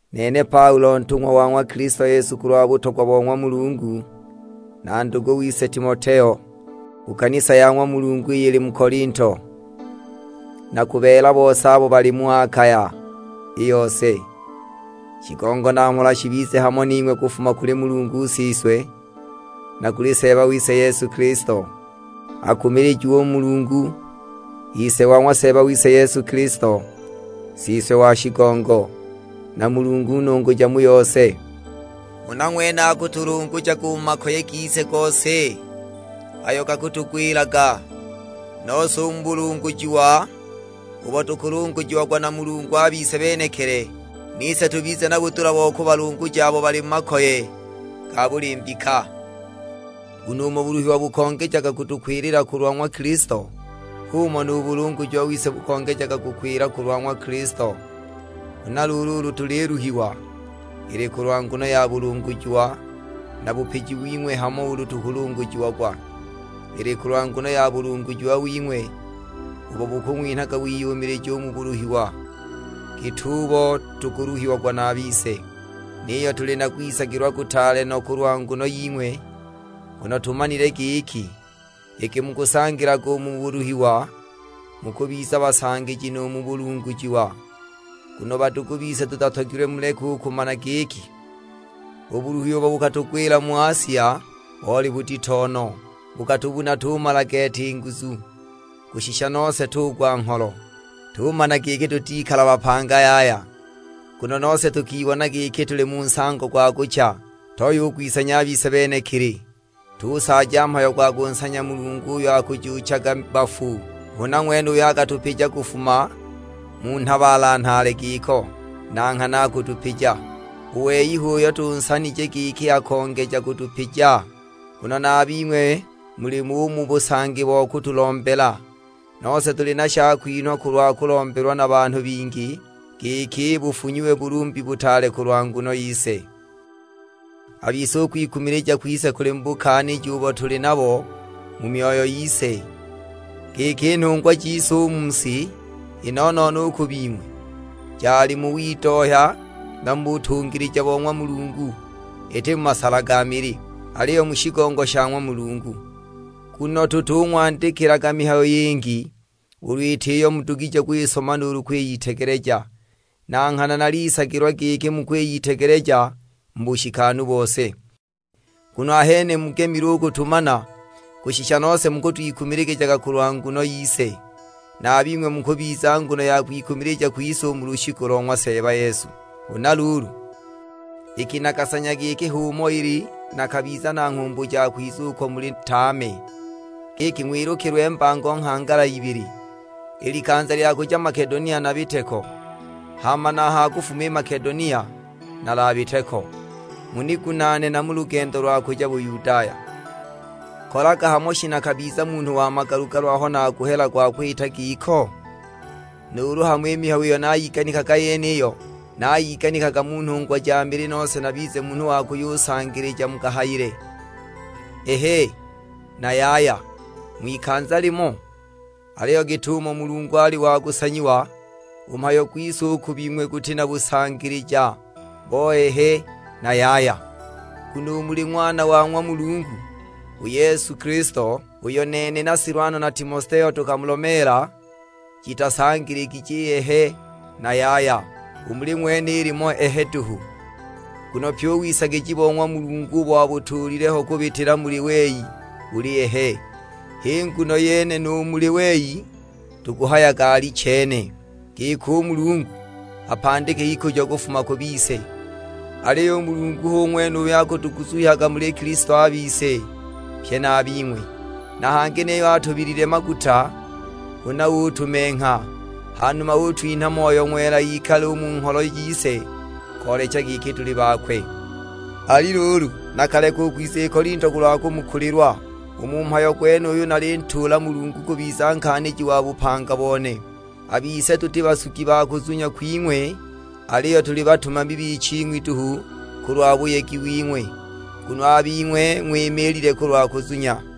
Nene Paulo ntung'wa wa ng'wa Kilisto Yesu kulwa butogwa bo ng'wa Mulungu, na ndugu wise Timoteo. Ku kanisa ya ng'wa Mulungu iyo ili mu Kolinto, na ku beela bose abo bali mu Akaya i yose. Shigongo na mhola shibize hamo ning'we kufuma kuli Mulungu Siswe, na kuli Seeba wise Yesu Kilisto. Akumilijiwe u Mulungu, Ise wa ng'wa Seeba wise Yesu Kilisto, Siswe wa shigongo, na Mulungu nunguja mu yose. Huna ng'wene akutulungujaga u mu makoye gise gose, ayo gakutugwilaga; nose u mu bulungujiwa ubo tukulungujiagwa na Mulungu a bise benekili, nise tubize na budula bo kubalunguja abo bali mu makoye ga buli mbika. Nguno umo buluhiwa bukongejaga kutukwilila kulwa ng'wa Kilisto, h'umo nu bulungujiwa wise bukongejaga kukwila kulwa ng'wa Kilisto. Huna luulu ulu tuliluhiwa, ili kulwa nguno ya bulungujiwa na bupiji wing'we; hama ulu tukulungujiagwa, ili kulwa nguno ya bulungujiwa wing'we ubo bukung'winhaga wiyumilija u mu buluhiwa git'ubo tukuluhiagwa na a bise. Niyo tuli na kwisagilwa kutaale no kulwa nguno ying'we, nguno tumanile giki, iki mukusangilaga u mu buluhiwa, mukubiza basangiji nu mu bulungujiwa. Nguno badugu bise tutatogilwe muleke u kumana giki, u buluhi ubo bukatugwila mu Asia boli budito no, bukatubuna tumala gete i nguzu; kushisha nose tugwa ngholo, tumana giki tutikala bapanga yaya! Nguno nose tukibona giki tuli mu nsango gwa kucha; toya u kwisanya a bise benekili, tusaaja mhayo gwa kunsanya Mulungu uyo akajuuchaga bafu. Huna ng'wene uyo akatupija kufuma mu nhabaala nhaale giko, na nghana akutupija. U wei h'uyo tunsanije giki akongeja kutupija; nguno na a bing'we mulimo u mu busangi bo kutulombela. Nose tuli na shakwinhwa kulwa kulombelwa na banhu bingi, giki bufunyiwe bulumbi butaale kulwa nguno yise. A bise u kwikumilija kwise kuli mu bukaaniji ubo tuli nabo mu myoyo yise, giki i nhungwa jise u mu si, i no-no-no u ku bing'we, jali mu widohya na mu butungilija bo ng'wa Mulungu, iti mu masala ga mili; aliyo mu shigongo sha ng'wa Mulungu. Nguno tutung'wandikilaga mihayo yingi, ulu iti iyo mudugije kwisoma nuulu kwiyitegeleja; na nghana nalisagilwa giki mukwiyitegeleja mu bushikanu bose. Nguno ahene mugemile u kutumana, kushisha nose mukwikumilijaga kulwa nguno yise. Na a bing'we mukubiza nguno ya kwikumilija kwise u mu lushiku lo ng'wa Seeba Yesu. Huna luulu, iki nakasanya giki h'umo ili, nakabiza na nghumbu ja kwiza uko muli tame; giki ng'wilukilwe mbango nghangala ibili. I likanza lya kuja Makedonia nabite ko, hama na a ha kufuma i Makedonia nalabite ko, munigunaane na mu lugendo lwa kuja Buyudaya. Kolaga hamo shi nakabiza munhu wa magalu-galu aho naguhela gwa kwita giko? Nuulu hamo i mihayo iyo nayiganikaga yeniyo, nayiganikaga mu nhungwa ja mili nose nabize munhu wa kuyusangilija mu kahayile, Ehe na Yaya, ng'wikanza limo? Aliyo git'umo Mulungu ali wa kusanyiwa, u mhayo gwise u ku bing'we guti na busangilija bo Ehe na Yaya! Nguno u muli Ng'wana wa ng'wa Mulungu, u Yesu Kilisto, uyo nene na Silwano na Timoteo tukamulomeela, jitasangiligije Ehe na Yaya, u muli ng'wene ilimo Ehe duhu. Nguno pyi u wisagija bo ng'wa Mulungu ubo abutuulile ho kubitila muli wei buli Ehe, h'i nguno yene u muli wei tukuhayaga Alichene; giki u Mulungu apandike ikujo kufuma ku bise. Aliyo u Mulungu hu ng'wene uyo akutuguzuhyaga muli Kilisto a bise, pye na a bing'we. Na hangi niyo atubilile maguta, huna utumengha; hanuma utwinha Moyo Ng'wela ikale u mu ngholo jise, koolecha giki tuli bakwe. Ali luulu, nakaleka u kwiza i Kolinto kulwa kumukulilwa; u mu mhayo gwenuyu nalintuula Mulungu kubiza nkaaniji wa bupanga bone. A bise tuti basugi ba kuzunya kwing'we, aliyo tuli batumami biching'wi duhu kulwa buyegi wing'we; nguno a bing'we ng'wimiilile kulwa kuzunya.